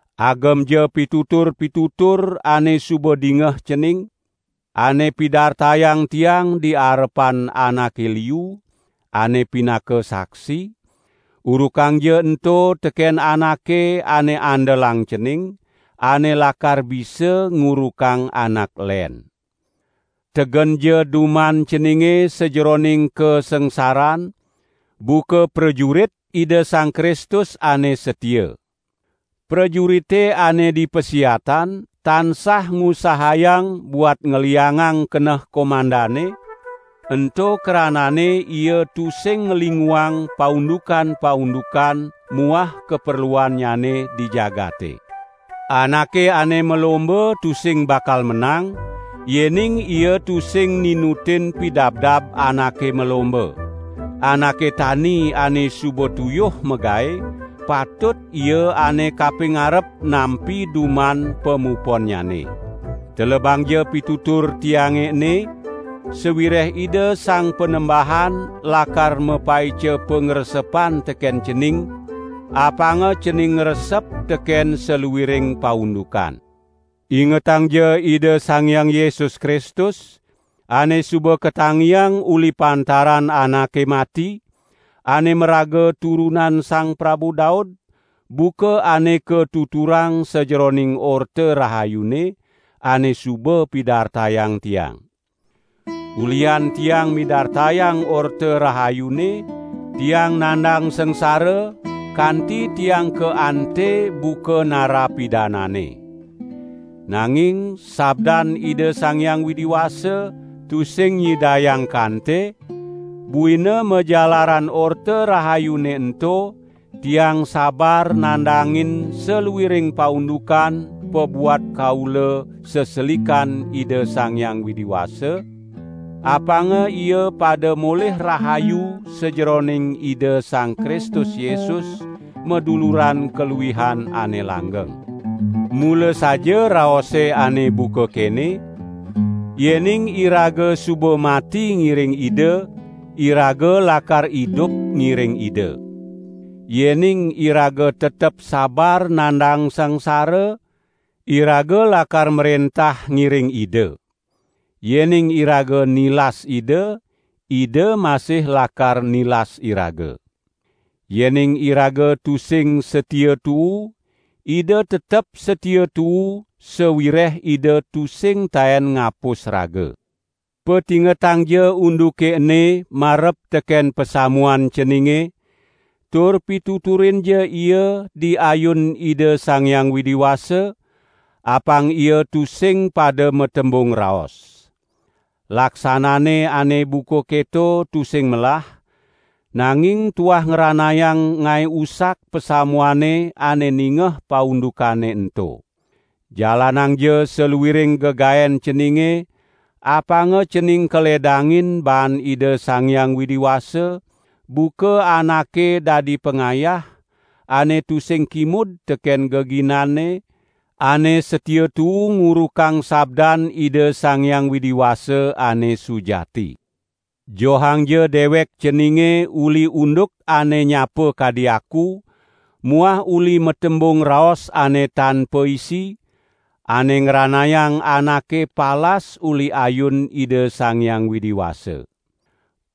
Agemja pitutur-pitutur ane suba dingeh cening, ane pidartayang tiang di arepan anake liu, ane pinaka saksi; urukangja ento teken anake ane andelang cening, ane lakar bisa ngurukang anak len. Tegenja duman ceninge sajeroning kasangsaran, buka prajurit Ida Sang Kristus ane satia. Prajurite ane di pasiatan tansah ngusahayang buat ngliangang keneh komandanne, ento kranane ia tusing nglinguang paundukan-paundukan muah kaperluannyane di jagate. Anake ane malomba tusing bakal menang, yening ia tusing ninutin pidabdab anake malomba. Anake tani ane suba tuyuh magae, patut ia ane kapingarep nampi duman pamuponnyane. Telebangja pitutur tiange ene, sawireh Ida Sang Panembahan lakar mapaica pangresepan teken cening, apanga cening ngresep teken saluiring paundukan. Ingetangja Ida Sang Hyang Yesus Kristus, ane suba katangiang uli pantaran anake mati, ane maraga turunan Sang Prabu Daud, buka ane katuturang sajeroning Orta Rahayune, ane suba pidartayang tiang. Ulihan tiang midartayang Orta Rahayune, tiang nandang sangsara, kanti tiang kaante buka narapidanane. Nanging sabdan Ida Sang Hyang Widi Wasa, tusing nyidayang kante, buina majalaran Orta Rahayune ento, tiang sabar nandangin saluiring paundukan pabuat kaula seselikan Ida Sang Hyang Widi Wasa, apanga ia pada molih rahayu sajeroning Ida Sang Kristus Yesus, maduluran kaluihan ane langgeng. Mula saja raose ane buka kene: "Yening iraga suba mati ngiring Ida, iraga lakar idup ngiring Ida. Yening iraga tetep sabar nandang sangsara, iraga lakar mrentah ngiring Ida. Yening iraga nilas Ida, Ida masih lakar nilas iraga. Yening iraga tusing satia tuu, Ida tetep satia tuu sawireh Ida tusing taen ngapus raga!" Patingetangja unduke ene marep teken pasamuan ceninge, tur pituturinja ia, di ayun Ida Sang Hyang Widi Wasa, apang ia tusing pada matembung raos. Laksanane ane buka keto tusing melah, nanging tuah ngranayang ngae usak pasamuane ane ningeh paundukane ento. Jalanangja saluiring gegaen ceninge, apanga cening kaledangin baan Ida Sang Hyang Widi Wasa, buka anake dadi pangayah, ane tusing kimud teken geginanne, ane satia tuu ngurukang sabdan Ida Sang Hyang Widi Wasa ane sujati. Johangja dewek ceninge uli unduk ane nyapa kadi aku muah uli matembung raos ane tan paisi, ane ngranayang anake palas uli ayun Ida Sang Hyang Widi Wasa.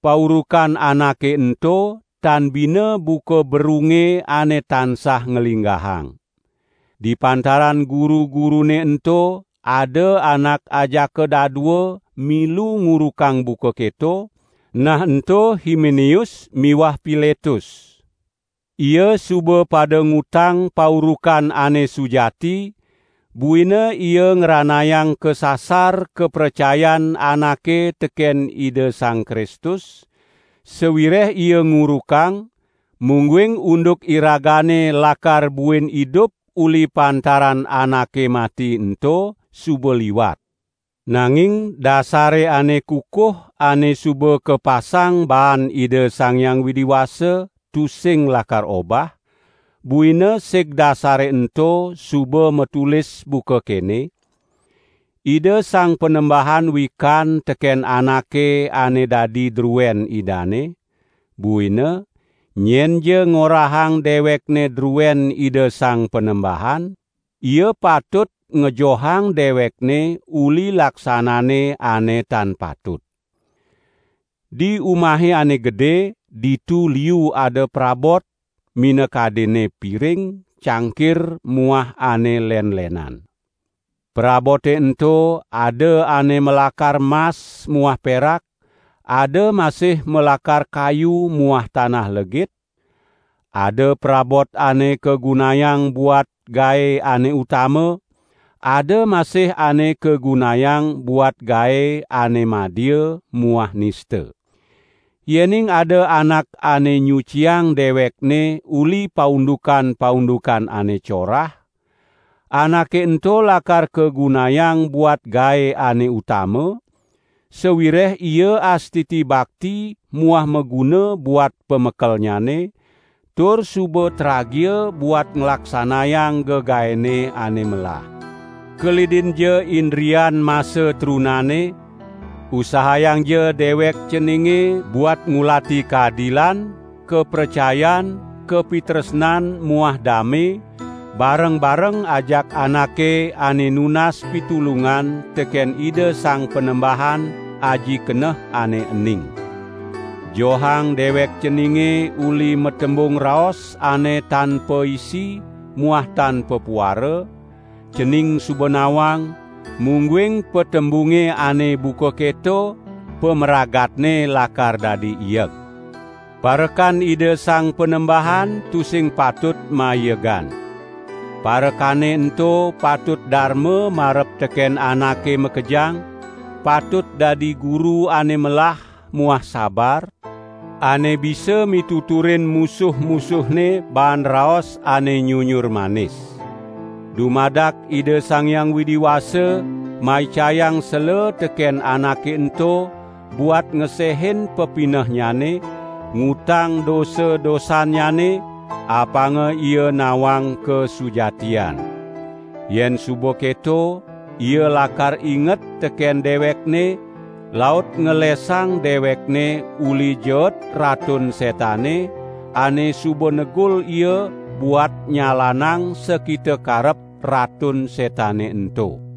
Paurukan anake ento tan bina buka berunge ane tansah nglinggahang. Di pantaran guru-gurune ento ada anak ajaka dadua milu ngurukang buka keto, nah ento: Himeneus muah Piletus. Ia suba pada ngutang paurukan ane sujati buina ia ngranayang kasasar kapracayan anake teken Ida Sang Kristus, sawireh ia ngurukang, mungguing unduk iragane lakar buin idup uli pantaran anake mati ento suba liwat. Nanging dasare ane kukuh ane suba kapasang baan Ida Sang Hyang Widi Wasa tusing lakar obah; buina sig dasare ento suba matulis buka kene: "Ida Sang Panembahan wikan teken anake ane dadi druen Idane", buina, "nyenja ngorahang dewekne druen Ida Sang Panembahan, ia patut ngejohang dewekne uli laksanane ane tan patut". Di umahe ane gede, ditu liu ada prabot, minakadinne piring, cangkir muah ane len-lenan. Prabote ento ada ane malakar mas muah perak, ada masih malakar kayu muah tanah legit; ada prabot ane kagunayang buat gae ane utama, ada masih ane kagunayang buat gae ane madia muah nista. Yening ada anak ane nyuciang dewekne uli paundukan-paundukan ane corah, anake ento lakar kagunayang buat gae ane utama, sawireh ia astiti bakti muah maguna buat Pamekelnyane, tur suba tragia buat nglaksanayang gegaene ane melah. Kelidinja indrian masa trunane, usahayangja dewek ceninge buat ngulati kadilan, kapracayan, kapitresnan muah dame, bareng-bareng ajak anake ane nunas pitulungan teken Ida Sang Panembahan aji keneh ane ening. Johang dewek ceninge uli matembung raos ane tan paisi muah tan papuara; cening suba nawang, mungguing patembunge ane buka keto pamragatne lakar dadi ieg. Parekan Ida Sang Panembahan tusing patut maiegan. Parekane ento patut darma marep teken anake makejang, patut dadi guru ane melah muah sabar, ane bisa mituturin musuh-musuhne baan raos ane nyunyur manis. Dumadak Ida Sang Hyang Widi Wasa maicayang sela teken anake ento buat ngesehin pepinehnyane, ngutang dosa-dosannyane, apanga ia nawang kasujatian. Yen suba keto ia lakar inget teken dewekne laut ngelesang dewekne uli jeet Ratun Setane ane suba negul ia buat nyalanang sakita karep Ratun Setane ento.